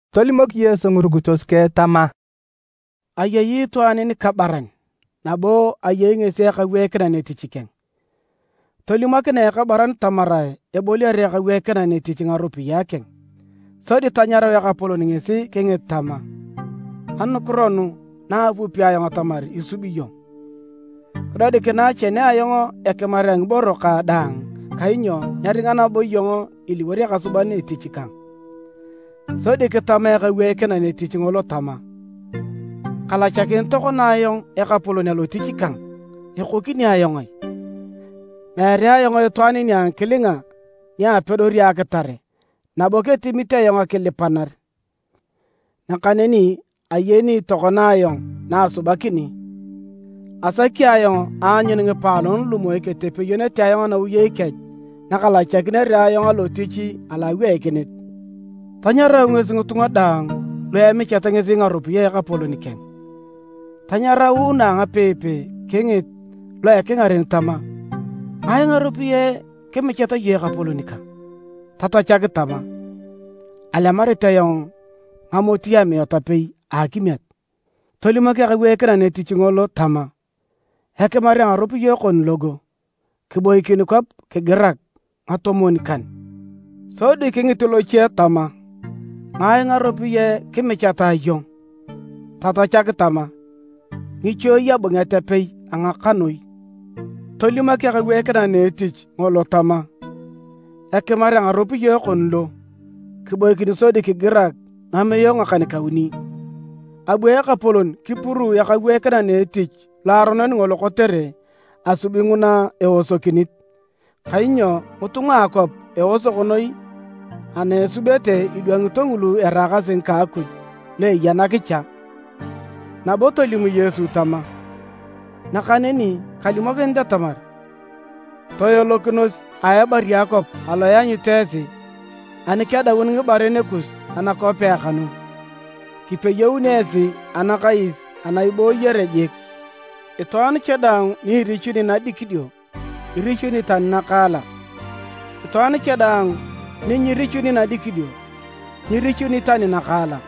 Tolimok Yesu ngirukitos keng tama, “Ayei itwaan nikabaran, nabo ayei ngesi ekaweikinan etich keng. Tolimokinae ekabaran tamarae eboliar ekaweikinan etich ngaropiyae keng, sodi tanyarau ekapolon ngesi kingit tama, ‘Anukiro nugu na apupi ayong atamar isubi iyong? Kidodikinae chene ayong ekimar a ngiboro kang daang kainyo nyeringa nabo iyong iliwor ekasuban etich kang.’ Sodi kitama ekaweikinan etich ngolo tama, ‘Kalachakini tokona ayong ekapolon alotich kang, ekokini ayong ai? Meere ayong itwaan nia ngikilinga ni apedori akitare nabo ketimit ayong akilipanar. Nakaneni ayeni tokona ayong na asubakini! Asaki ayong aanyun ngipaalon lu moi ketepeyonete ayong anawiyei kech nakalachakinere ayong alotich alo aweikinit.’ Tanyarau ngesi ngitunga daang lu emichat ngesi ngaropiyae a ekapolon keng. Tanyaraunu angapeipei kingit lo a ekingaren tama, ‘Ngai ngaropiyae kimichat iyong ekapolon kang?’ Tatachak tama, ‘Alemarit ayong ngamoti amiat apei a akimiet.’ Tolimok ekaweikinan etich ngolo tama, ‘Ekimar a ngaropiyae kon logo, kiboikin kwap kigirak ngatomwon-kan.’ Sodi kingit loche tama, ‘Ngai ngaropiyae kimichatae iyong?’ Tatachak tama, ‘Ngichuei abunget apei a ngakanoi.’ Tolimok ekaweikinan a etich ngolo tama, ‘Ekimar a ngaropiyae kon lo, kiboikin sodi kigirak ngamiae ngakan-kauni!’ Abu ekapolon kipuruu ekaweikinan etich loaronon ngolo kotere asubi nguna eosokinit, kainyo ngitunga a akwap eosok noi ana esubete idwangito ngulu eraakasi ngika Akuj lu eya nakicha.” Nabo tolim Yesu tama, “Nakaneni kalimokinit atamar: toelokinos a ebari a akwap alo ianyut esi. Ani kedaun ngibaren kus anakwapea kanu, kipeyounio esi anakais ana ibooyere jik. Itwaan cha daang ni irichuni nadikidio, irichuni tani nakaalak: itwaan cha daang ni nyirichuni nadikidio, nyirichuni tani nakaalak.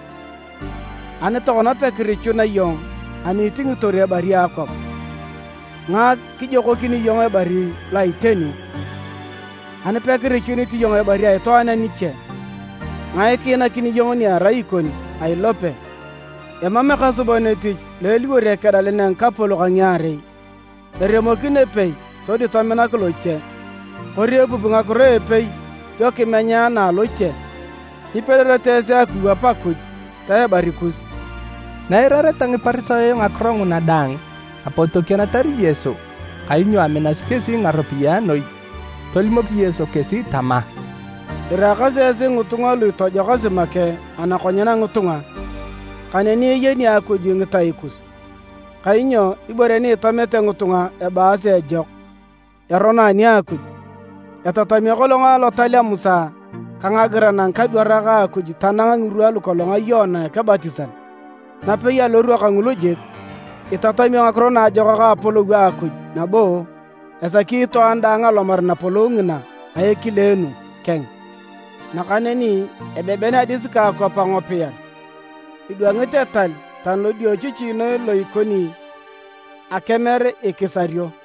Ani tokona pekirichuna iyong ani itingitor ebari a akwap, ngae kijokokini iyong ebari lo a iteni? Ani pekirichunit iyong ibore a itwaan a niche, ngae kiinakini iyong ni erai ikon a ilope? “Emam ekasuban etich lo eliwor ekedalan a ngikapolok a ngiarei, eremokin epei sodi tominak loche, kori epupi ngakiro a epei dio kimenya na aloche. Nyipedorete esi akiwap Akuj ta ebari kus.” Na eirareta Ngiparisayo ngakiro nguna daang, apot tokienatar Yesu, kainyo aminasi kesi ngaropiyae noi. Tolimok Yesu kesi tama, “Iraakasi esi ngitunga lu itojokasi make anakonyen a ngitunga, nakaneni eyeni Akuj ngitai kus, kainyo ibore ni itamete ngitunga ebaasi ejok, erono ani a Akuj. “Etatamio kolong etal a Musa ka ngagiran a ngikadwarak a Akuj tanang ngirwa lukolong a Yoana Ekebatisan. Napei alorwa kangulu jik, itatamio Ngakiro Naajokak a Apolou a Akuj nabo esaki itwaan daang alomar Napolou ngina a ekileenu keng. Nakaneni ebeben adis ka akwap angopiar, idwangit etal tani lodiochichi noi lo ikoni akemer ikisario.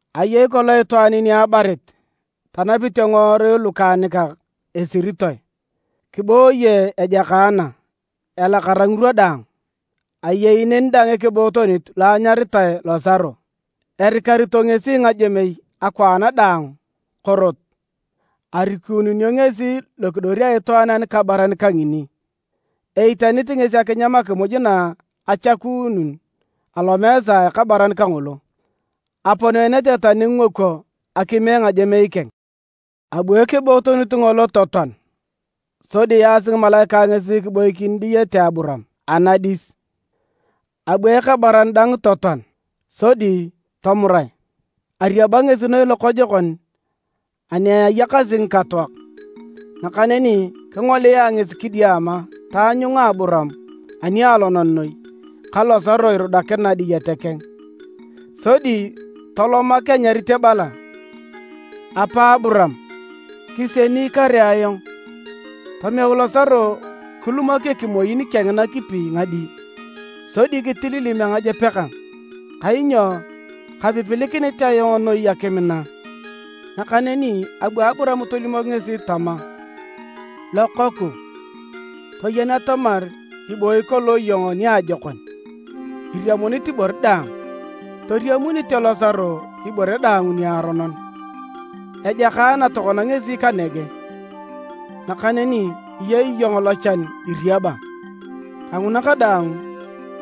“Ayei kolong itwaan ni abarit, tanapite ngiworui lukaanikak esiritoe, kibooye ejakaana, elakara ngirwa daang. Ayei neni dang ekebootonit lo anyaritae Losaro. Erikarito ngesi ngajemei akwaan daang korot, arikununio ngesi lokidor a itwaan anikabaran kangini. Eitanit ngesi akinyam akimuj na achakuunun alomeesa a ekabaran kangolo. Aponeenete tani ngingokwo akime ngajemei keng. Abu ekebootonit ngolo totoan, sodi yaasi ngimalaikae ngesi kiboikin diyete Aburaam, anadis. Abu ekabaran dang totoan, sodi tomurae. Ariaba ngesi noi lokojokon ani ayakasi ngikatoak. Nakaneni kingolia ngesi kidiama taanyunga Aburaam anialonan noi, ka Losaro irudakina diyete keng. Sodi tolomak anyarit ebala, ‘Apa Aburaam, kisieni kare ayong! Tomeu Losaro kilumok ekimoin keng nakipi ngadi, sodi kitililim angajep kang, kainyo kapipilikinit ayong noi akim na!’ Nakaneni abu Aburaam tolimok ngesi tama, ‘Lokooku, toyen atamar ibooyi kolong iyong niajokon iriamunit ibore daang, toriamunete Losaro ibore daang niaronon, ejakaana tokona ngesi kanege, nakaneni iyei iyong lochan iriaba. Kanguna kadaang,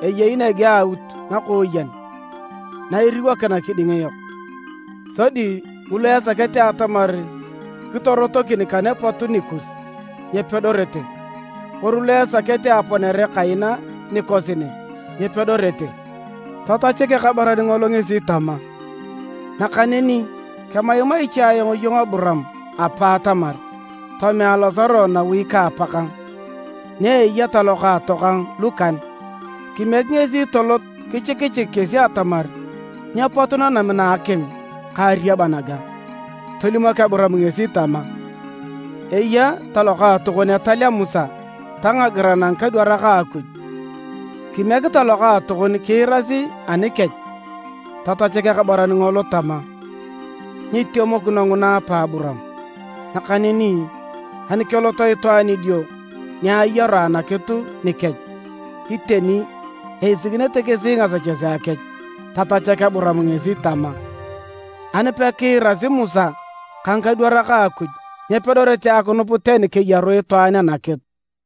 eyei nege aaut nakooyen na iriwokina kiding yok, sodi ngulu esakete atamar kirotokini kane apotu nikus, nyepedorete, kori lu esakete aponere kaina nikosi ne, nyepedorete.’ Tatachak ekabaran ngolo ngesi tama, ‘Nakaneni kemaimai cha ayong iyong apa Aburaam atamar tomea Losaro nawi ka apa kang, ni eya talokaato kang lukan: kimiek ngesi tolot kichikichik kesi atamar nyeepot nanam na a akim ka ariaba naga.’ Tolimok Aburaam ngesi tama, ‘Eya talokaatokon etal a Musa ta ngagiran a ngikadwarak a Akuj, kimiek talokaatokon kiirasi anikech.’ Tatachak ekabaran ngolo tama, ‘Nyitemokino nguna apa Aburaam! Nakaneni ani kelot itwaan idio ni ayaru anakitu nikech, iteni eisikinete kesi ngasechesea kech.’ Tatachak Aburaam ngesi tama, ‘Ani pekiirasi Musa ka ngikadwarak a Akuj, nyepedorete akinup tani keyaru itwaan anakitu.’”